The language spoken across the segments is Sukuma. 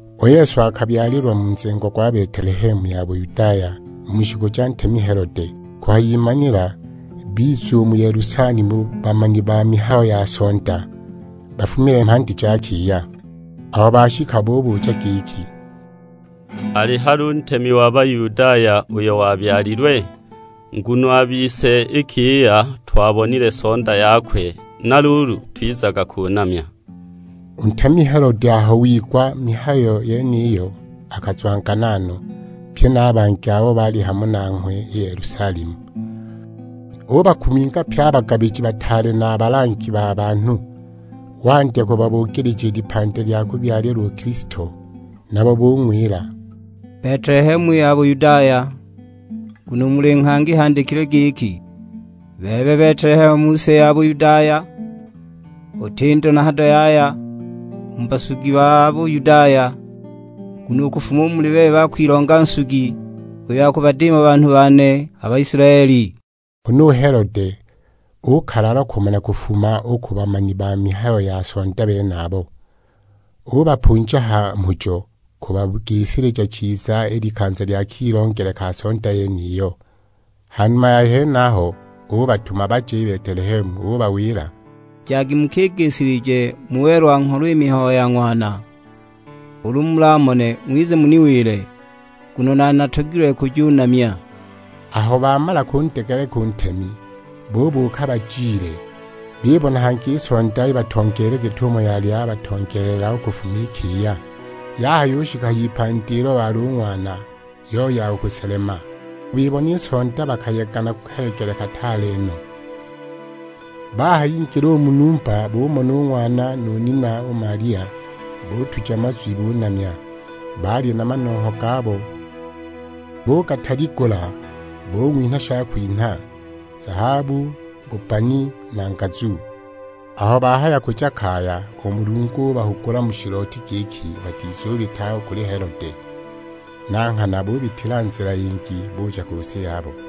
U Yesu akabyalilwa mu nzengo gwa Betelehemu ya Buyudaya, mu shiku ja ntemi Helode. Kuhayimanila biza u mu Yelusalemu bamani ba mihayo ya sonda, bafumile mhandi ja kiya. Aho bashika bubuja giki, "Ali hali u Ntemi wa Bayudaya uyo wabyalilwe? Nguno a bise i kiya twabonile sonda yakwe, na luulu twizaga kunamya." U ntemi Helode aho wigwa i mihayo yeniyo akazwangana no, pye na a bangi abo baali hamo nanghwe i Yelusalemu. Ubakuminga pye a bagabiji bataale na a balangi ba banhu, wandya kubabugilija i lipandi lya kubyalilwa u Kilisto. Nabo bung'wila, "Betelehemu ya Buyudaya, nguno u muli nghangi handikilwe giki, Bebe Betelehemu mu si ya Buyudaya, uti ndo na hado yaya u mu basugi ba Buyudaya, nguno u kufuma muli bebe akwilonga Nsugi, uyo akubadiima banhu bane, a Baisilaeli.' " Huna u Helode ukalalwa kumana kufuma u ku bamani ba mihayo ya sonda benabo. Ubapunja ha mhujo kubagisilija chiza i likanza lya kilongele ka sonda yeniyo. Ha numa ya henaho ubatuma baje i Betelehemu; ubawila, "Jagi mukigisilije mu welwa-ngholo i mihayo ya ng'wana. Ulu mulamone ng'wize muniwile, nguno nane natogilwe kujunamya!" Aho bamala kundegeleka u ntemi, bubuuka bajile. Bibona hangi i sonda ibatongeelile, git'umo yali yabatongeelela u kufuma i kiya. Yahayushika a h'ipandi ilo wali u Ng'wana, yoya u kuselema. Aho bibona i sonda bakayega na kayegele kataale no! Bahayingila u mu numba, bumona u Ng'wana nu nina u Malia, butuja mazwi bunamya. Baali na manongho gabo, bugataligula bung'winha shakwinha: zahabu, bubbani, na ngazu. Aho bahaya kuja kaya, u Mulungu ubahugula mu shilooti giki batizubita u kuli Helode. Na nghana bubitila nzila yingi buja ku si yabo.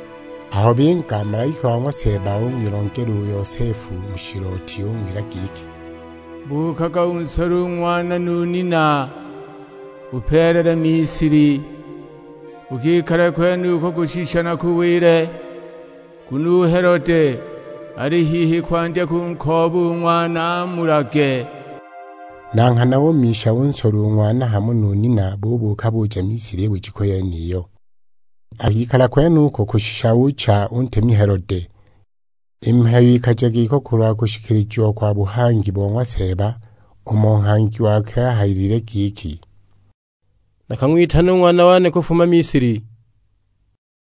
Aho binga, malaika wa ng'wa Seeba ung'wilongela u Yosefu mu shilooti; ung'wila giki, "Buukaga unsole u Ng'wana nu nina, upeelele Misili, ukikale kwenuko kushisha nakuwile. Nguno u Helode ali hihi kwandya kunkooba u Ng'wana amulage." Na nghana umisha, unsola u Ng'wana hamo nu nina, bubuuka kuja Misili i bujiku yeniyo. Akikala kwenuko kushisha ucha u ntemi Helode. I mihayo ikaja giko kulwa kushikilijiwa kwa buhangi bo ng'wa Seeba; umo nghangi wakwe ahayilile giki, "Nakang'witana u Ng'wana wane kufuma Misili."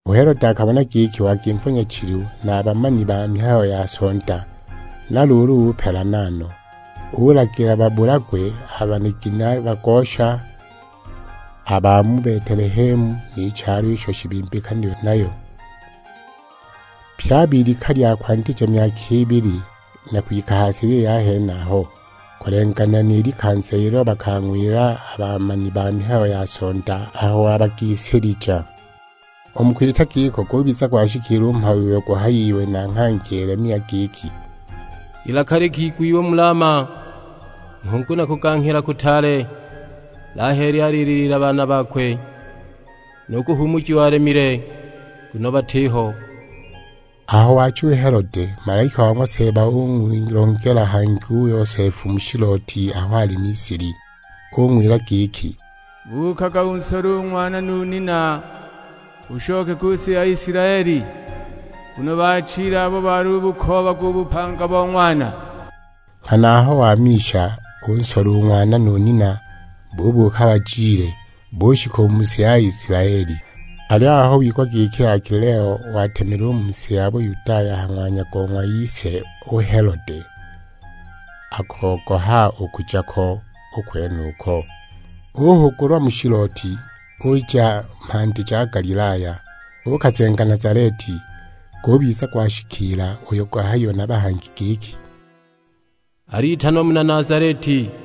U Helode akabona giki wagimva nyachilu na a bamani ba mihayo ya sonda, na luulu upelana no. Ulagila babulagwe a banigini a bagosha, a ba mu Betelehemu, ni chalo isho shibimbikanilwe nayo; pye a b'ilika lya kwandija myaka ibili na kwika ha silili ya henaho, kulenganila ni likanza ilo bakang'wila a bamani ba mihayo ya sonda, aho wabagisilija. U mu kwita giko gubiza gwashikiila u mhayo uyo guhayiwe na nghangi Yelemia; giki, "Ilaka likigwiwa mu Lama, nghungu na kuganghila kutaale; Laheli alililiila baana bakwe, nu kuhuumujiwa alemile nguno batiho!" Aho waacha u Helode, malaika wa ng'wa Seeba ung'wilongela hangi u Yosefu mu shilooti aho ali Misili. Ung'wila giki, "Buukaga unsole u Ng'wana nu nina ushoke ku si ya Isilaeli; nguno baachile abo balubukoobaga u bupanga bo Ng'wana." Nghana aho wamisha unsola u Ng'wana nu nina, bubuuka bajile; bushika u mu si ya Isilaeli. Aliyo aho wigwa giki Akelao watemile u mu si ya Buyudaya a ha ng'wanya go ng'wa ise u Helode, akogoha u kuja ko u kwenuka. Uhugulwa mu shilooti, uja mhandi ja Galilaya, uukazenga Nazaleti. Gubiza gwashikiila uyo guhayiwe na bahangi giki, "Alitanwa muna Nazaleti."